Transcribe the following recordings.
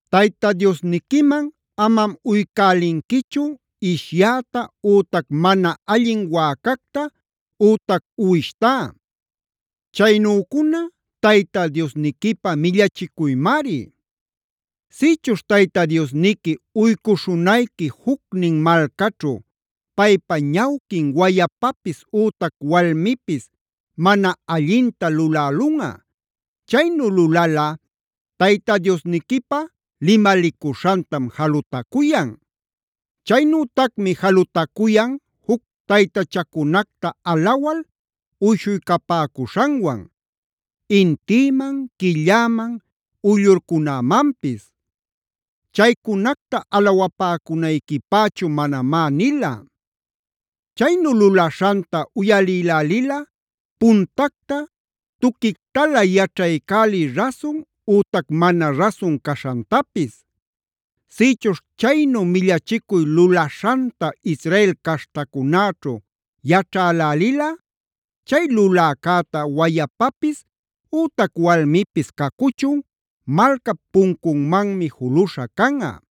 “Tayta Diosniquiman amam uycälinquichu ishyäta ütac mana allin wäcacta ütac uwishtá. Chaynücuna Tayta Diosniquipä millachicuymari. “Sïchuśh Tayta Diosniqui uycuśhunayqui jucnin malcaćhu paypa ñawquin wayapapis ütac walmipis mana allinta lulälunꞌa; chaynu lulalꞌa Tayta Diosniquipa limalicuśhantam jalutacuyan. Chaynütacmi jalutacuyan juc taytachacunacta alawal uyshuycapäcuśhanwan: intïman, quilläman, uyllurcunämanpis. Chaycunacta alawapäcunayquipächu manamá nila. Chaynu lulaśhanta uyalïlälilꞌa puntacta tuquictalä yaćhaycäliy rasun ütac mana rasun caśhantapis. Sïchuśh chaynu millachicuy lulaśhanta Israel caśhtacunäćhu yaćhälälilꞌa, chay luläcäta wayapapis ütac walmipis cacuchun malcap puncunmanmi juluśha canꞌa.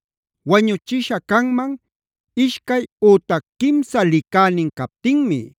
“Wañuchisha canman ishcay ütac quimsa licänin captinmi;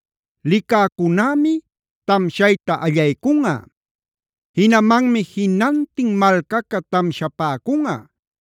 Licäcunämi tamshayta allaycunꞌa; jinamanmi jinantin malcaca tamshapäcunꞌa.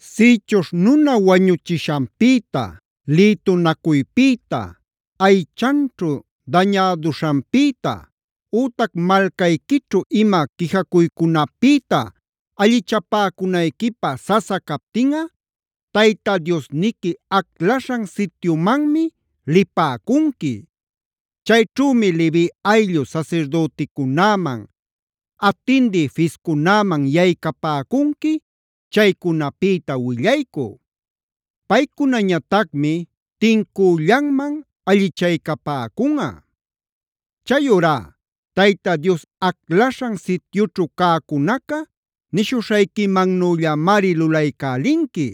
“Sïchuśh nuna wañuchishanpïta, lïtunacuypïta, aychanćhu dañäduśhanpïta ütac malcayquićhu ima quijacuycunapïta allichapäcunayquipä sasa captinꞌa Tayta Diosniqui aclaśhan sityumanmi lipäcunqui. Chayćhümi Levi ayllu sasirdüticunäman, atindï fiscunäman yaycapäcunqui chaycunapïta willaycü. Paycunañatacmi tincüllanman allichaycapäcunꞌa. Chayurá Tayta Dios aclaśhan sityućhu cäcunaca nishuśhayquimannüllamari lulaycälinqui.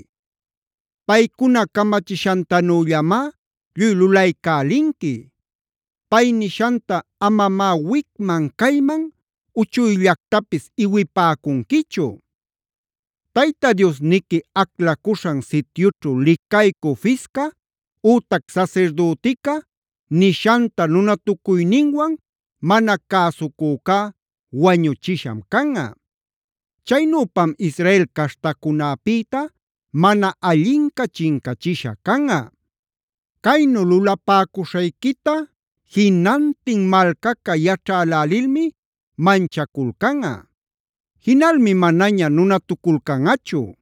Paycuna camachishantanüllamá lluy lulaycälinqui. Pay nishanta amamá wicman cayman uchuyllactapis iwipäcunquichu. Tayta Diosniqui aclacuśhan sityućhu licaycü fisca ütac sasirdütica nishanta nunatucuyninwan mana cäsucücá wañuchisham canꞌa. Chaynüpam Israel caśhtacunäpïta mana allinca chincachisha canꞌa. Caynu lulapäcuśhayquita jinantin malcaca yaćhälälilmi manchaculcanꞌa; jinalmi manaña nunatuculcanꞌachu.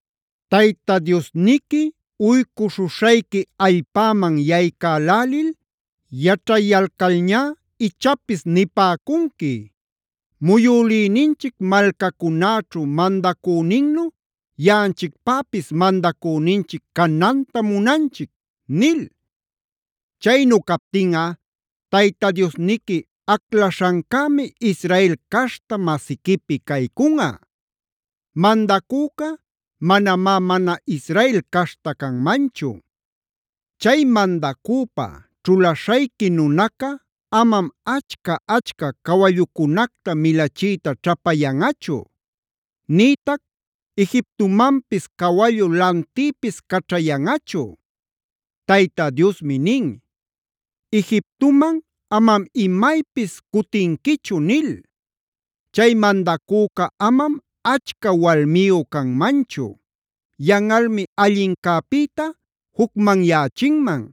“Tayta Diosniqui uycuśhuśhayqui allpäman yaycälälil yaćhayalcalñá ichapis nipäcunqui: ‘Muyülïninchic malcacunäćhu mandacüninnu yaꞌanchicpäpis mandacüninchic canantam munanchic’d nil. Chaynu captinꞌa Tayta Diosniqui aclaśhancämi Israel caśhta masiquipi caycunꞌa. Mandacüca manamá mana Israel caśhta canmanchu. Chay mandacüpä ćhulaśhayqui nunaca amam achca-achca cawallucunacta milachiyta ćhapayanꞌachu. Nïtac Egiptomanpis cawallu lantïpis caćhayanꞌachu.e Tayta Diosmi nin: ‘Egiptoman amam imaypis cutinquichu’ nil. Chay mandacüca amam achca walmiyu canmanchu;f yanꞌalmi allincäpïta jucmanyächinman.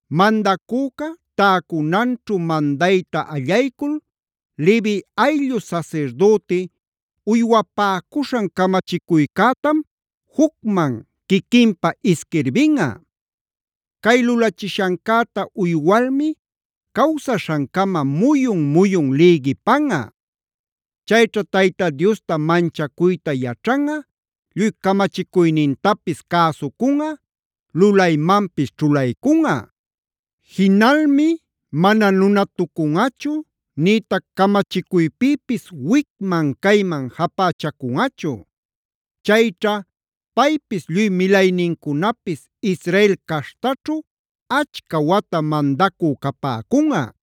“Mandacüca täcunanćhu mandayta allaycul Levi ayllu sasirdüti uywapäcuśhan camachicuycätam jucman quiquinpä isquirbinꞌa. Cay lulachishancäta uywalmi cawsaśhancama muyun-muyun lïgipanꞌa. Chayćha Tayta Diosta manchacuyta yaćhanꞌa, lluy camachicuynintapis cäsucunꞌa, lulaymanpis ćhulaycunꞌa. Jinalmi mana nunatucunꞌachu, nïtac camachicuypïpis wicman cayman japächacunꞌachu. Chayćha paypis lluy milaynincunapis Israel caśhtaćhu achca wata mandacü capäcunꞌa.